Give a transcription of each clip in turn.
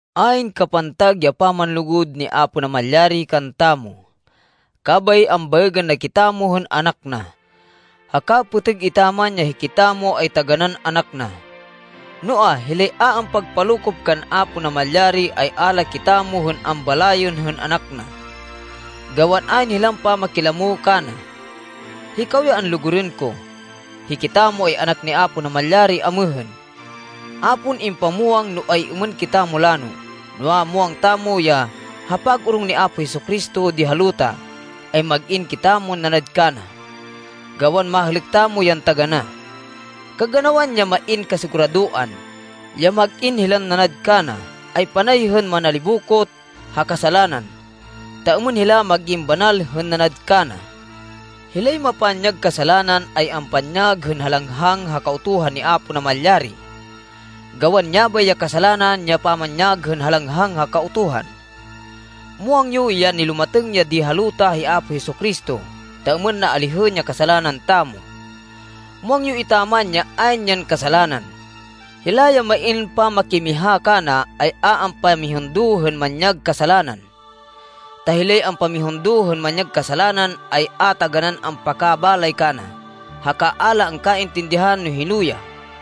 Ayn kapantag ya pamanlugud ni Apo Namalyari kantamo, kabay ambaêgên na kitamo hên anak na. Haka pêtêg etaman ya hikitamo ay taganán anak na. Noa, hilay a ampagpalokop kan Apo Namalyari, ay a la kitamo hên ambalayên hên anak na, gawan ayn hilan pamakilamo kana. Hikaw ya anlugurên ko, hikitamo ay anak ni Apo Namalyari amêhên. A pon impamwang no ay-êmên kitamo lano. Noa, muwang tamo ya, ha pag-orong ni Apo Jesu-Cristo di ha luta, ay mag-in kitamon nanad kana, gawan mahêlêk tamo yan taganá. Kaganawan ya main kasiguradoan, ya mag-in hilan nanad kana, ay panay hên manalibokot ha kasalanan, ta êmên hila mag-in banal hên nanad kana. Hilay mapanyag kasalanan, ay ampanyag hên halanghang ha Kautuhan ni Apo Namalyari. Gawan yabay ya kasalanan, ya pamanyag hên halanghang ha Kautuhan. Muwang yo ya nilumatêng ya di ha luta hi Apo Jesu-Cristo ta êmên na alihên ya kasalanan tamo. Muwang yo etaman ya ayn yan kasalanan. Hila ya main pamakimiha kana ay a ampamihundo hên manyag kasalanan, ta hilay ampamihundo hên manyag kasalanan, ay a taganán ampakabalay kana haka a la angkaintindihan no hino ya.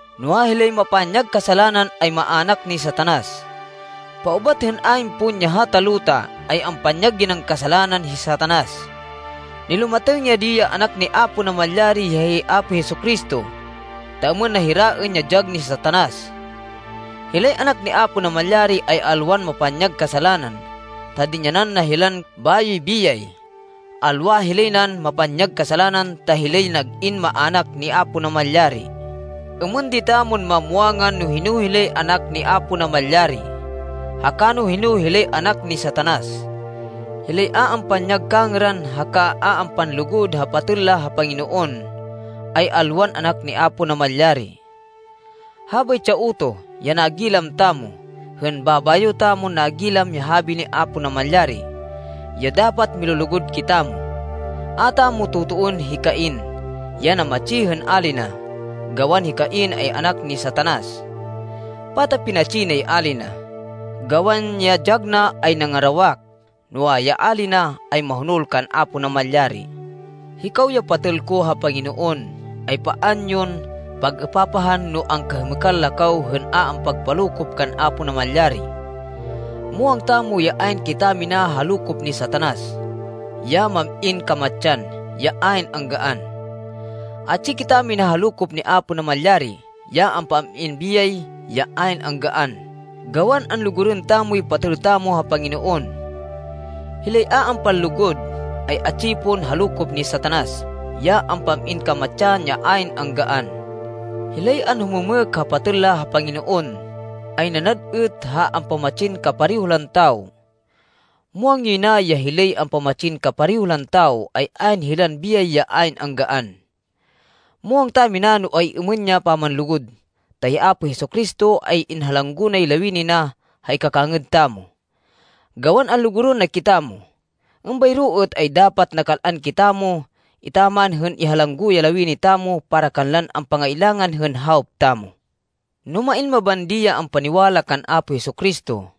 Noa, hilay mapanyag kasalanan, ay maának ni Satanas. Paubat hên ayn pon ya hata luta, ay ampanyag yay nan kasalanan hi Satanas. Nilumatêng ya di ya Anak ni Apo Namalyari ya hi Apo Jesu-Cristo, ta êmên na hiraên ya dyag ni Satanas. Hilay anak ni Apo Namalyari ay alwan mapanyag kasalanan ta dinyanan na hilan bayoy biyay. Alwa hilay nan mapanyag kasalanan ta hilay nag-in maának ni Apo Namalyari. Êmên di tamon mamwangan no hino hilay anak ni Apo Namalyari, haka no hino hilay anak ni Satanas. Hilay a ampanyag kangêran haka a ampanlugud ha patêl la ha Panginoon, ay alwan anak ni Apo Namalyari. Habaytsi ya utoh, ya nagilam tamo, hên babayo tamon nagilam ya habi ni Apo Namalyari, ya dapat milulugud kitamo. A tamo totoên hi Cain ya namatsi hên ali na, gawan hi Cain ay anak ni Satanas. Pata pinatsi nay ali na? Gawan ya dyag na ay nangarawak, noa, ya ali na ay mahonol kan Apo Namalyari. Hikaw ya patêl ko ha Panginoon, ay paan yon pag-êpapahan no angkahêmêkan la kaw hên a ampagpalokop kan Apo Namalyari. Muwang tamo ya ayn kitamina ha lokop ni Satanas, ya mam-in kamatsan, ya ayn anggaan. Atsi kitamina ha lokop ni Apo Namalyari, ya ampam-in biyay ya ayn anggaan gawan anlugurên tamoy patêl tamo ha Panginoon. Hilay a ampanlugud, ay atsi pon ha lokop ni Satanas, ya ampam-in kamatsan ya ayn anggaan. Hilay anhumêmêk ha patêl la ha Panginoon, ay nanad êt ha ampamatsin kapareho lan tawo. Muwang yoy na ya hilay ampamatsin kapareho lan tawo, ay ayn hilan biyay ya ayn anggaan. Muwang tamina no ay-êmên ya pamanlugud, ta hi Apo Jesu-Cristo ay inhalanggo nay lawini na ha ikakangêd tamo, gawan anlugurên na kitamo. Êmbayro êt ay dapat nakal-an kitamo etaman hên ihalanggo ya lawini tamo para kanlan ampangailangan hên hawop tamo. No main mabandi ya ampaniwala kan Apo Jesu-Cristo,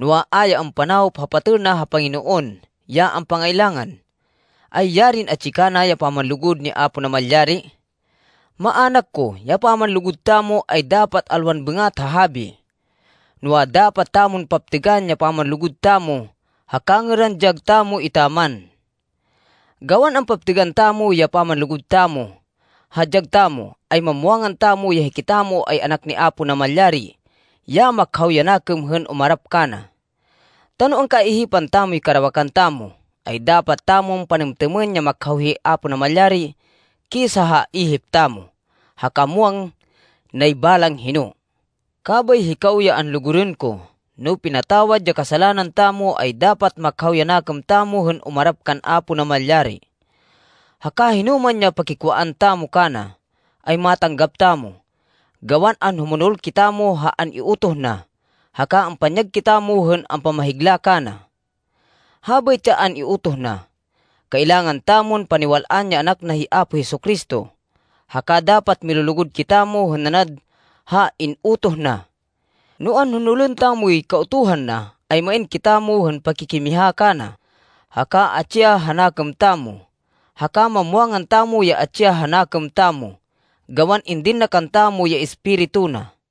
noa, a ya ampanawop ha patêl na ha Panginoon ya ampangailangan, ay yarin atsi kana ya pamanlugud ni Apo Namalyari! Maának ko, ya pamanlugud tamo ay dapat alwan bêngat ha habi, noa, dapat tamon paptêgan ya pamanlugud tamo ha kangêran dyag tamo etaman. Gawan ampaptêgan tamo ya pamanlugud tamo ha dyag tamo, ay mamwangan tamo ya hikitamo ay anak ni Apo Namalyari ya makhaw ya nakêm hên umarap kana. Ta no angkaihipan tamoy karawakan tamo, ay dapat tamon panêmtêmên ya makhaw hi Apo Namalyari kisa ha ihip tamo, haka muwang nay balang hino. Kabay, hikaw ya anlugurên ko, no pinatawad ya kasalanan tamo, ay dapat makhaw ya nakêm tamo hên umarap kan Apo Namalyari. Haka hinoman ya pakikwaan tamo kana, ay matanggap tamo, gawan anhumonol kitamo ha an-iutoh na, haka ampanyag kitamo hên ampamakahigla kana. Habaytsi ya an-iutoh na: kailangan tamon paniwal-an ya Anak na hi Apo Jesu-Cristo, haka dapat milulugud kitamo hên nanad ha in-utoh na. No anhonolên tamoy kautuhan na, ay main kitamo hên pakikimiha kana, haka atsi ya ha nakêm tamo. Haka mamwangan tamo ya atsi ya ha nakêm tamo, gawan indin na kantamo ya Espiritu na.